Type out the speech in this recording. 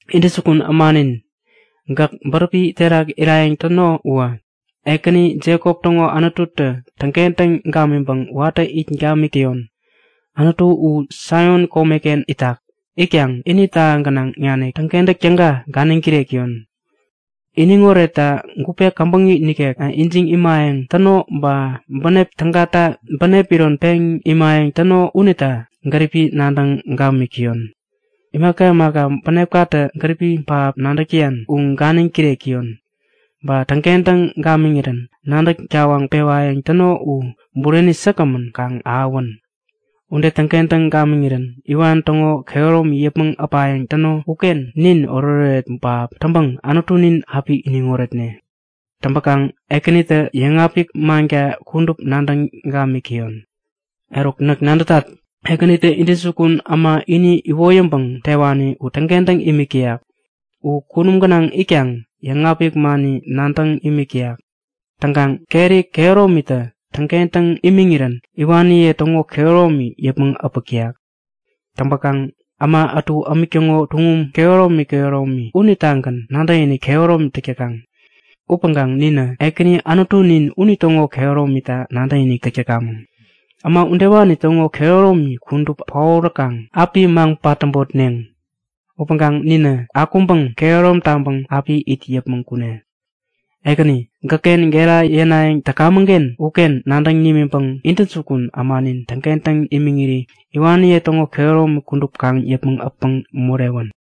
Intäjukun ämanin, gäk bäräpi terak irayäŋ täno uwä, Ekäni, Jekop täŋo Anututä täŋkentäŋ gamiŋpäŋ watä it gamik täyon! Anutu u Saion komeken itak. Itkaŋ ini täha gänaŋ nanik täŋkentäk täga ganiŋ kirek täyon. Iniŋ oretta gupe käbäŋi nikek ijiŋ imayäŋ täno ba bänep tägata bänep iron peŋ imayäŋ täno unita gäripi nadäŋ gamik täyon. Imaka imaka bänepkatä gäripi pähap nadäk täyan u ganiŋ kirek täyon. Ba täŋkentäŋ gamiŋirän nadäk-tawaŋ pewayäŋ täno u bureni säkgämän kaŋ ahäwän! Ude täŋkentäŋ gamiŋirän iwan täŋo kehäromi yäpmäŋ äpayäŋ täno uken nin oretoret pähap täŋpäŋ Anutunin api iniŋ oretne! Täŋpäkaŋ Ekänitä yäŋapik manka kudup nadäŋ gamik täyon. Eruk, näk nadätat! Ekänitä intäjukun äma ini iwoyäŋpäŋ tewani u täŋkentäŋ imik täyak. U kunum gänaŋ itkaŋ yäŋapik mani nadäŋ imik täyak. Täŋkaŋ keri kehäromitä täŋkentäŋ imiŋirän iwaniye täŋo kehäromi yäpmäŋ äpäk täyak. Täŋpäkaŋ äma ätu ämik täŋo tuŋum kehäromi kehäromi unitagän nadäkinik kehäromi täk täkaŋ. Upäŋkaŋ ninä Ekäni Anutunin unitäŋo kehäromita nadäkinik täk täkamäŋ. Äma udewani täŋo kehäromi kudup paoräkaŋ api maŋ-patäbotneŋ. Upäŋkaŋ ninä akuŋpäŋ kehärom taŋpäŋ api it yäpmäŋ kune. Ekäni, gäkken gera yänayäŋ täkamäŋken uken nadäŋ nimiŋpäŋ intäjukun ämanin täŋkentäŋ imiŋiri iwaniye täŋo kehäromi kudup kaŋ yäpmäŋ äpäŋ morewän!